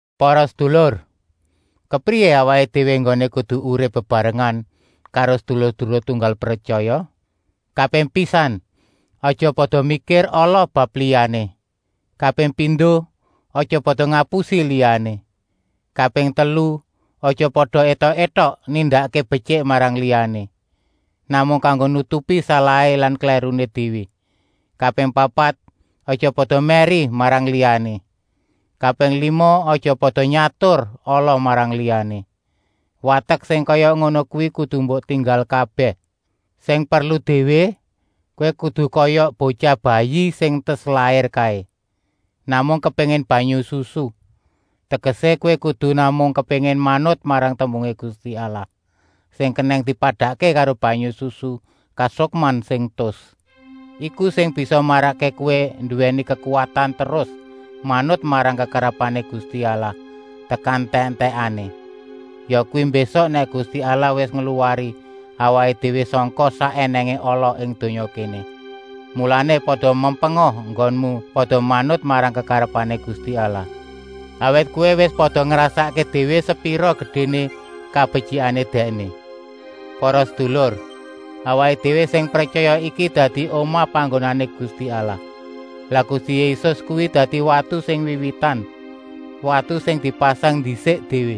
Para sedulur, kepriyé awaké déwé enggoné kudu urip bebarengan karo sedulur-sedulur tunggal pretyaya? Kaping pisan, aja pada mikir ala bab liyané. Kaping pindo, aja pada ngapusi liyané. Kaping telu, aja pada étok-étok nindakké betyik marang liyané, namung kanggo nutupi salahé lan klèruné déwé. Kaping papat, aja pada mèri marang liyané. Kaping lima, aja pada nyatur ala marang liyané. Watek sing kaya ngono kuwi kudu mbok tinggal kabèh. Sing perlu déwé, kowé kudu kaya botyah bayi sing entas lair kaé, namung kepéngin banyu susu, tegesé kowé kudu namung kepéngin manut marang tembungé Gusti Allah, sing kenèng dipadakké karo banyu susu kasukman sing tus. Iku sing bisa marakké kowé nduwèni kekuwatan terus manut marang kekarepané Gusti Allah tekan entèk-entèkané, yakuwi mbésuk nèk Gusti Allah wis ngluwari awaké déwé sangka sak ènèngé ala ing donya kéné. Mulané, pada mempenga enggonmu pada manut marang kekarepané Gusti Allah, awit kowé wis pada ngrasakké déwé sepira gedéné kabetyikané Dèkné. Para sedulur, awaké déwé sing pretyaya iki dadi omah panggonané Gusti Allah. Lah Gusti Yésus kuwi dadi watu sing wiwitan, watu sing dipasang ndisik déwé,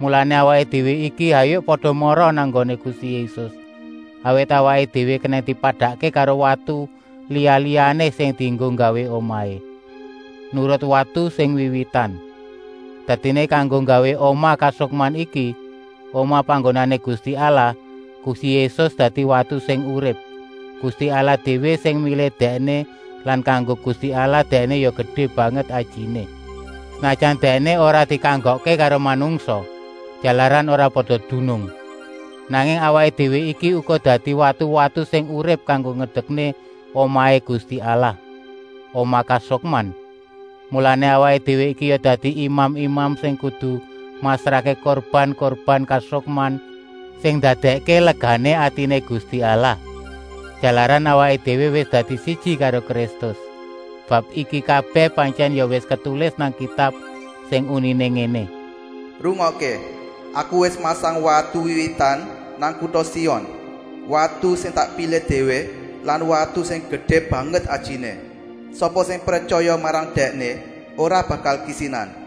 mulané awaké déwé iki hayuk pada mara nang nggoné Gusti Yésus, awit awaké déwé kenèng dipadakké karo watu liya-liyané sing dienggo nggawé omahé, nurut watu sing wiwitan. Dadiné kanggo nggawé omah kasukman iki, omah panggonané Gusti Allah, Gusti Yésus dadi watu sing urip. Gusti Allah déwé sing milih Dèkné lan kanggo Gusti Allah Dèkné ya gedé banget ajiné, senajan Dèkné ora dikanggokké karo manungsa, jalaran ora pada dunung. Nanging awaké déwé iki uga dadi watu-watu sing urip kanggo ngedekké omahé Gusti Allah, omah kasukman. Mulané awaké déwé iki ya dadi imam-imam sing kudu masrahké kurban-kurban kasukman sing ndadèkké legané atiné Gusti Allah, jalaran awaké déwé wis dadi siji karo Kristus. Bab iki kabèh pantyèn ya wis ketulis nang Kitab sing uniné ngéné: “Rungokké, Aku wis masang watu wiwitan nang kuta Sion, watu sing tak pilih déwé lan watu sing gedé banget ajiné. Sapa sing pretyaya marang Dèkné ora bakal kisinan.”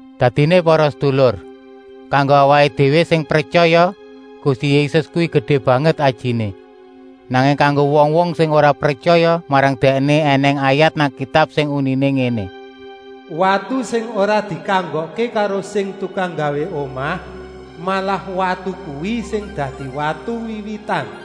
Dadiné para sedulur, kanggo awaké déwé sing pretyaya, Gusti Yésus kuwi gedé banget ajiné. Nanging kanggo wong-wong sing ora pretyaya marang Dèkné ènèng ayat nang Kitab sing uniné ngéné: “Watu sing ora dikanggokké karo sing tukang nggawé omah, malah watu kuwi sing dadi watu wiwitan.”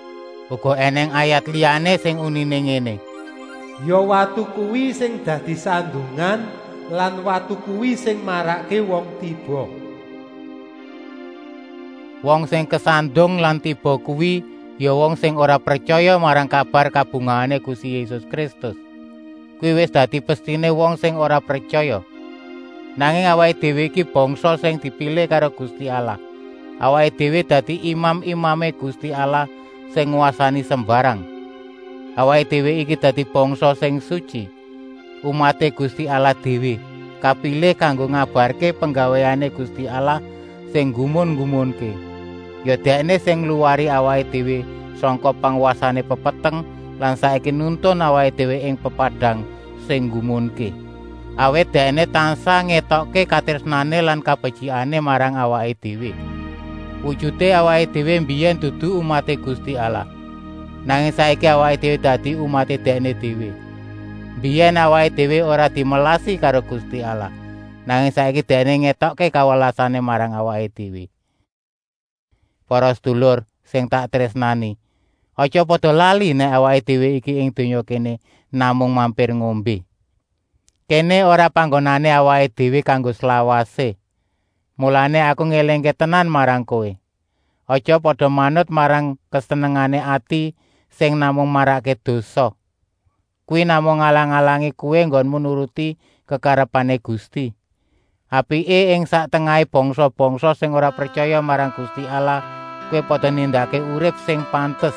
Uga ènèng ayat liyané sing uniné ngéné: “Ya watu kuwi sing dadi sandungan lan watu kuwi sing marakké wong tiba.” Wong sing kesandung lan tiba kuwi ya wong sing ora pretyaya marang kabar kabungahané Gusti Yésus Kristus. Kuwi wis dadi pestiné wong sing ora pretyaya. Nanging awaké déwé iki bangsa sing dipilih karo Gusti Allah, awaké déwé dadi imam-imamé Gusti Allah sing ngwasani sembarang. Awaké déwé iki dadi bangsa sing sutyi, umaté Gusti Allah déwé, kapilih kanggo ngabarké penggawéné Gusti Allah sing nggumun-nggumunké. Ya Dèkné sing ngluwari awaké déwé sangka pangwasané pepeteng lan saiki nuntun awaké déwé ing pepadang sing nggumunké, awit Dèkné tansah ngétokké katrésnané lan kabetyikané marang awaké déwé. Wujuté awaké déwé mbiyèn dudu umaté Gusti Allah, nanging saiki awaké déwé dadi umaté Dèkné déwé. Mbiyèn awaké déwé ora dimelasi karo Gusti Allah, nanging saiki Dèkné ngétokké kawelasané marang awaké déwé. Para sedulur sing tak trésnani, aja pada lali nèk awaké déwé iki ing donya kéné namung mampir ngombé. Kéné ora panggonané awaké déwé kanggo slawasé. Mulané aku ngélingké tenan marang kowé: aja pada manut marang kesenengané ati sing namung marakké dosa. Kuwi namung ngalang-alangi kowé enggonmu nuruti kekarepané Gusti. Apiké, ing sak tengahé bangsa-bangsa sing ora pretyaya marang Gusti Allah kowé pada nindakké urip sing pantes.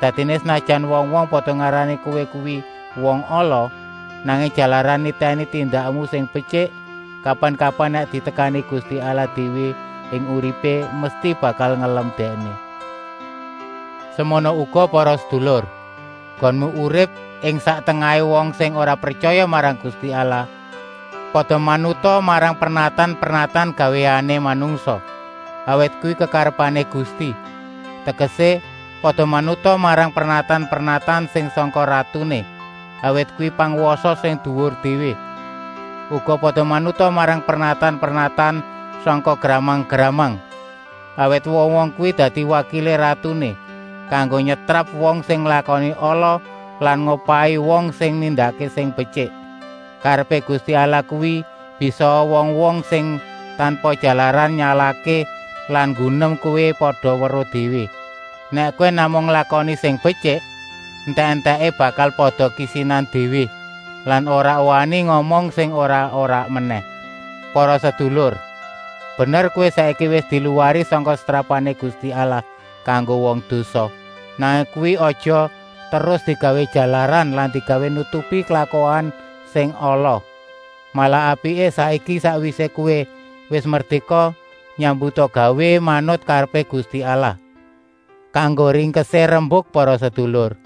Dadiné, senajan wong-wong pada ngarani kowé kuwi wong ala, nanging jalaran nitèni tindakmu sing betyik, kapan-kapan nèk ditekani Gusti Allah déwé ing uripé, mesti bakal ngelem Dèkné. Semono uga para sedulur, enggonmu urip ing sak tengahé wong sing ora pretyaya marang Gusti Allah, pada manuta marang pernatan-pernatan gawéané manungsa, awit kuwi kekarepané Gusti. Tegesé, pada manuta marang pernatan-pernatan sing sangka ratuné, awit kuwi pangwasa sing duwur déwé. Uga pada manuta marang pernatan-pernatan sangka gramang-gramang, awit wong-wong kuwi dadi wakilé ratuné kanggo nyetrap wong sing nglakoni ala lan ngupahi wong sing nindakké sing betyik. Karepé Gusti Allah kuwi, bisaa wong-wong sing tanpa jalaran nyalahké lan nggunem kowé pada weruh déwé, nèk kowé namung nglakoni sing betyik. Entèk-entèké bakal pada kisinan déwé lan ora wani ngomong sing ora-ora menèh. Para sedulur, bener kowé saiki wis diluwari sangka setrapané Gusti Allah kanggo wong dosa, nanging kuwi aja terus digawé jalaran lan digawé nutupi klakuan sing ala. Malah apiké, saiki, sakwisé kowé wis merdéka, nyambutgawéa manut karepé Gusti Allah. Kanggo ringkesé rembuk para sedulur,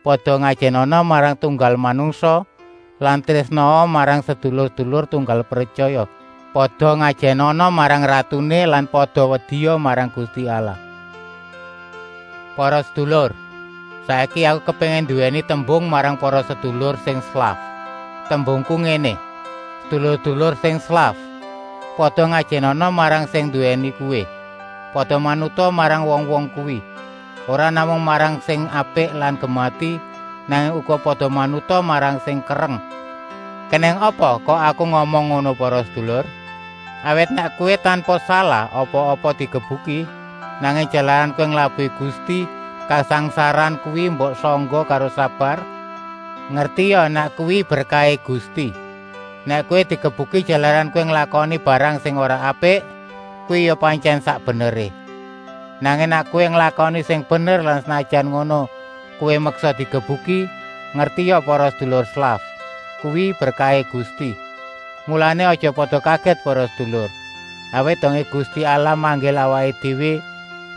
pada ngajènana marang tunggal manungsa lan trésnaa marang sedulur-sedulur tunggal pretyaya. Pada ngajènana marang ratuné lan pada wedia marang Gusti Allah. Para sedulur, saiki aku kepéngin nduwèni tembung marang para sedulur sing slaf. Tembungku ngéné: Sedulur-sedulur sing slaf, pada ngajènana marang sing nduwèni kowé. Pada manuta marang wong-wong kuwi, ora namung marang sing apik lan gemati, nanging uga pada manuta marang sing kereng. Kenèng apa kok aku ngomong ngono para sedulur? Awit nèk kowé tanpa salah apa-apa digebuki, nanging jalaran kowé nglabuhi Gusti kasangsaran kuwi mbok sangga karo sabar, ngertia nèk kuwi berkahé Gusti. Nèk kowé digebuki jalaran kowé nglakoni barang sing ora apik, kuwi ya pantyèn sak beneré. Nanging nèk kowé nglakoni sing bener lan senajan ngono kowé meksa digebuki, ngertia para sedulur slaf, kuwi berkahé Gusti. Mulané, aja pada kagèt para sedulur, awit dongé Gusti Allah manggil awaké déwé,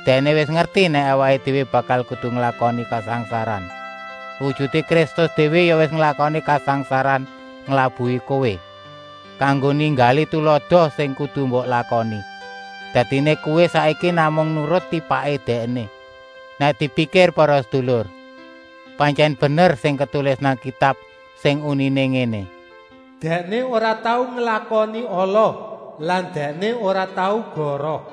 Dèkné wis ngerti nèk awaké déwé bakal kudu nglakoni kasangsaran. Wujuté Kristus déwé ya wis nglakoni kasangsaran nglabuhi kowé, kanggo ninggali tulada sing kudu mbok lakoni. Dadiné kowé saiki namung nurut tipaké Dèkné. Nèk dipikir para sedulur, pantyèn bener sing ketulis nang Kitab, sing uniné ngéné: “Dèkné ora tau nglakoni ala lan Dèkné ora tau goroh.”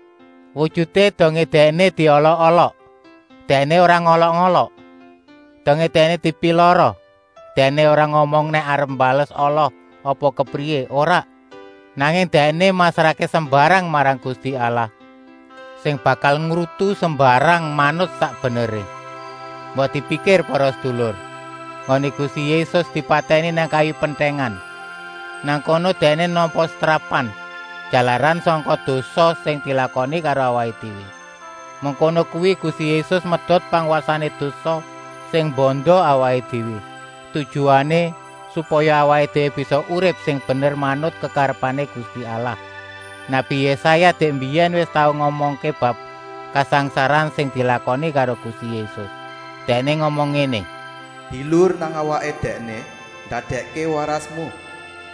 Wujuté dongé Dèkné diolok-olok, Dèkné ora ngolok-olok. Dongé Dèkné dipilara, Dèkné ora ngomong nèk arep mbales ala apa kepriyé, ora. Nanging Dèkné masrahké sembarang marang Gusti Allah, sing bakal ngrutu sembarang manut sak beneré. Mbok dipikir para sedulur, enggoné Gusti Yésus dipatèni nang kayu pentèngan. Nang kono Dèkné nampa setrapan, jalaran sangka dosa sing dilakoni karo awaké déwé. Mengkono kuwi Gusti Yésus medot pangwasané dosa sing mbanda awaké déwé, tujuané, supaya awaké déwé bisa urip sing bener manut kekarepané Gusti Allah. Nabi Yésaya dèk mbiyèn wis tau ngomongké bab kasangsaran sing dilakoni karo Gusti Yésus. Dèkné ngomong ngéné: “Bilur nang awaké Dèkné ndadèkké warasmu.”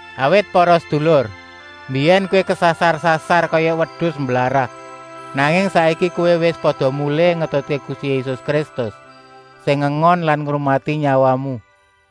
Awit para sedulur, mbiyèn kowé kesasar-sasar kaya wedus mblarah, nanging saiki kowé wis pada mulih ngetutké Gusti Yésus Kristus, sing ngengon lan ngrumati nyawamu.